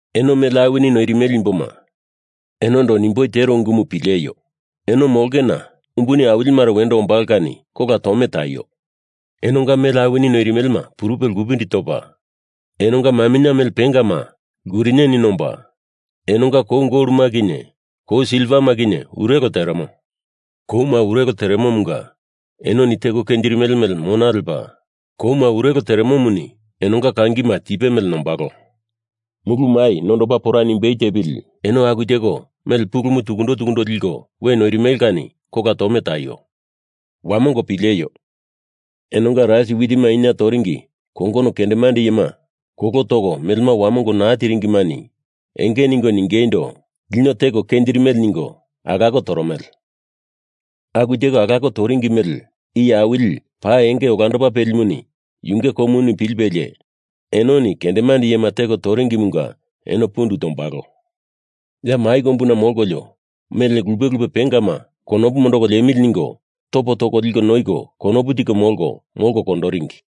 Eno mele awini noirimele imboma, enondo nimboi tero ungumu pileio. Eno molongena umbuni awili mare wendo ombalo kani kola tome taio! Enonga mele awini noirimelema purupe lkupindi topa, enonga maminye mele pengama lkuriniani nomba, enonga kou goloma kinye kou silvama kinye urelo teremo. Kouma urelo teremomunga enoni teko kenjirimele mele mona lepa, kouma urelo teremomuni enonga kangina tipe mele nombalo. Mulu mai nondopa pora nimbei tepili eno aku teko mele pulumu tukundo tukundo liko we noirimele kani kola tome taio. Wamongo pileio! Enonga rais witima inia tondoringi kongono kendemande iyema kolo toko melema wamongo naa tiringimani enge ningo ningeindo, lino teko kenjirimele ningo alako toromele. Aku teko alako toringi mele Iye Awili paa enge olandopa pelimuni yunge komuni pilipelie enoni kendemande iyema teko kenjiringimunga eno pundu tombalo. Ya mai kombuna molkolio mele lupe lupe pengama konopu mondoko liemili ningo topo toko liko noiko konopu tiko molko, molko kondoringi.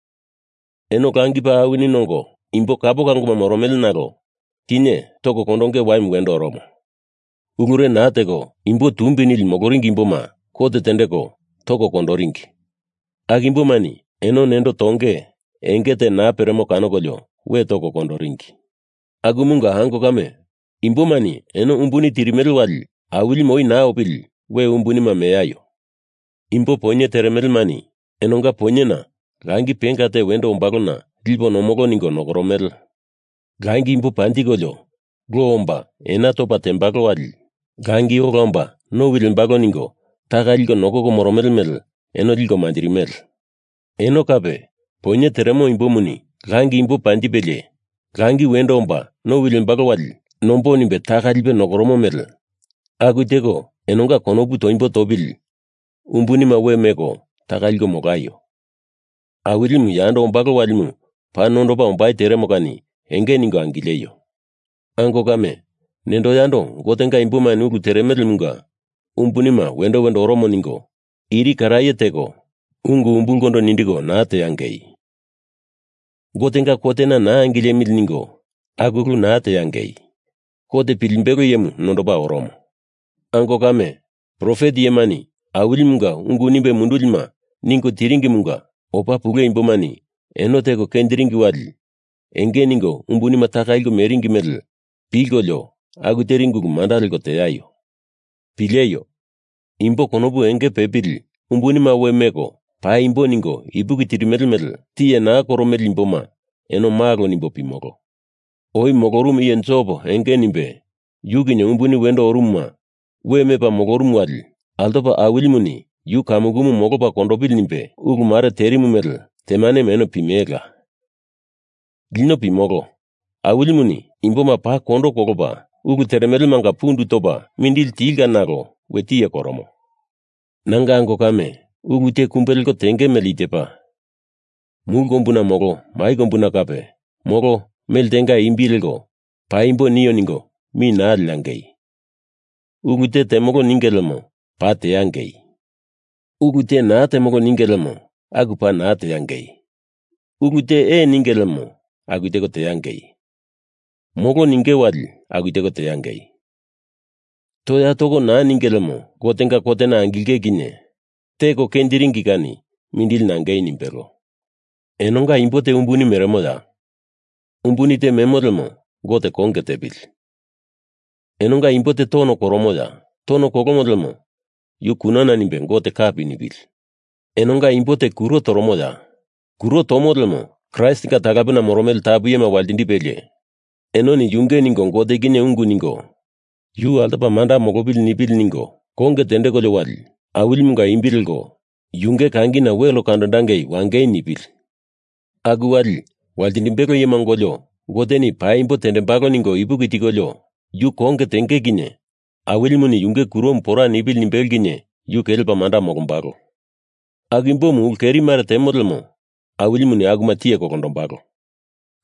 Eno langi paa awini nongo imbo kapo kangoma moromele nalo kinye toko kondonge waimu wendo oromo. Ulure naa teko imbo tumbi nili moloringi imboma kot tendeko toko kondoringi. Aku imbomani eno nendo tongei enge te naa peremo kanokolio we toko kondoringi. Akumunga, ango kame, imbomani eno umbunima tirimele wali Awilimu oi naa opili we umbunima meaio. Imbo poinye teremelemani enonga poinyena langi penga te wendo ombalona lipo nomolo ningo nokoromele. Langi imbo panjikolio lo omba ena tepa tembalo wali langi ola omba nowi lembalo ningo taka liko nokoko moromele mele eno liko manjirimele. Eno kape, poinye teremo imbomuni langi imbo panjipelie langi wendo omba nowi lembalo wali nombo nimbe taka lipe nokoromo mele aku teko enonga konopu toimbo topili umbunima we meko taka liko molaio. Awilimu yando ombalo walimu paa nondopa ombai teremo kani enge ningo angileio. Ango kame, nendo yando Gotenga imbomani ulu teremelemunga umbunima wendo wendo oromo ningo iri karaye teko ungu umbulkondo nindiko naa teangei. Gotenga kotena naa angilemili ningo aku ulu naa teangei. Kot Pilimbelo Iyemu nondopa oromo. Ango kame, profet iyemani Awilimunga ungu nimbe mundulima ningo tiringimunga opa pule imbomani eno teko kenjiringi wali enge ningo umbunima taka liko meringi mele pilkolio aku teringi ulu manda leko teaio. Pileio! Imbo konopu enge pepili umbunima we meko paimbo ningo ipuki tirimele mele tiye naa koromele imboma eno malo nimbo pimolo. Oi molorumu iye Jop enge nimbe, yu kinye umbuni wendo orumuma we mepa molorumu wali altopa Awilimuni yu kamukumu molopa kondopili nimbe ulu mare terimu mele temanemu eno pimelela. Lino pimolo, Awilimuni imboma paa kondo kolopa, ulu teremelemanga pundu topa mindili tilka nalo we tiye koromo. Nanga ango kame, ulu te kumbe leko tenge mele i tepa: Mulu kombuna molo mai kombuna kape, molo mele tenga imbi leko paimbo nio ningo mi naa leangei. Ulu te temolo ninge lemo paa teangei. Ulu te naa temolo ninge lemo aku paa naa teangei. Ulu te ee ninge lemo aku teko teangei. Molo ningei wali aku teko teangei. Toya toko naa ninge lemo Gotenga kotena angilinge kinye teko kenjiringi kani mindili nangei nimbelo. Enonga imbo te umbuni meremoya? Umbuni te memo lemo Gote konge tepili. Enonga imbo te tono koromoya? Tono kolomo lemo yu kunana nimbe Gote kapi nipili. Enonga imbo te kuro toromoya? Kuro tomo lemo Kraistinga talapena moromele tapu iyema waltindipelie enoni yunge ningo Gote kinye ungu ningo yu altopa manda molopili nipili ningo konge tendekolio wali Awilimunga imbi leko yunge kangina wel kandondangei wangei nipili Aku wali waltindimbelo iyema ongolio Goteni paimbo tembalo ningo ipuki tikolio yu konge tenge kinye Awilimuni yunge kuromu pora nipili nimbelo kinye yu kelepa manda molombalo. Aku imbomu ulu keri mare temo lemo Awilimuni akuma tiye kondombalola.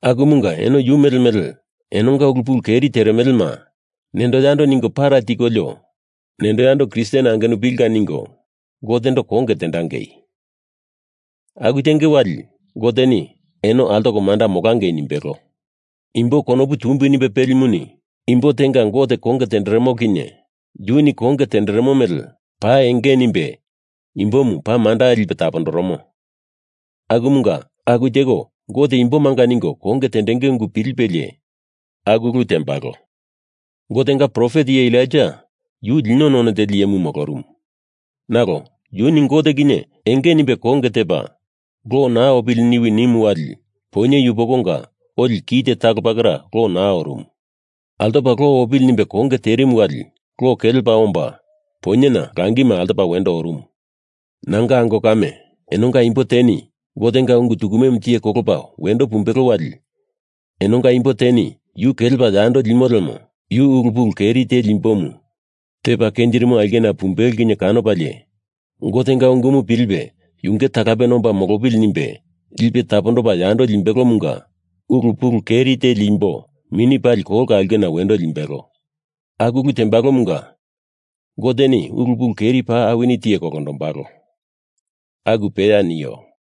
Akumunga eno yu mele mele enonga ulu pulu keri teremelema nendo yando ningo para tikolio nendo yando Kristen angenupilinga ningo Gotendo konge tendangei. Aku tenge wali Goteni eno altoko manda molangei nimbelo. Imbo konopu tumbi nimbe pelimuni imbo tenga Gote konge tenderemo kinye yuni konge tenderemo mele paa enge nimbe imbomu paa manda lipe tapondoromo. Akumunga aku teko Gote imbomanga ningo konge tendenge ungu pilipelie aku ulu tendembalo. Gotenga profet iye Elaija yu lino none teli iyemu molorumu. Nalo yuni Gote kinye enge nimbe konge tepa, lo naa opili niwi nimu wali poinye yupokonga oli kite talo pakera lo naa orumu. Altopa lo opili nimbe konge terimu wali lo kelepa omba poinyena langima altopa wendo orumu. Nanga ango kame, enonga imbo teni Gotenga ungu tukumemu tiye kolopa wendo pumbelo wali enonga imbo teni yu kelepa yando limo lemo yu ulu pulu keri teli imbomu tepa kenjirimo aulkena pumbelo kinye kanopalie Gotenga ungumu pilipe yunge talapena omba molopili nimbe lipe tapondopa yando limbelomunga ulu pulu keri teli imbo mini pali kolka aulkena wendo limbelo. Aku ulu tembalomunga Goteni ulu pulu keri paa awini tiye kolondombalo! Aku peya nio.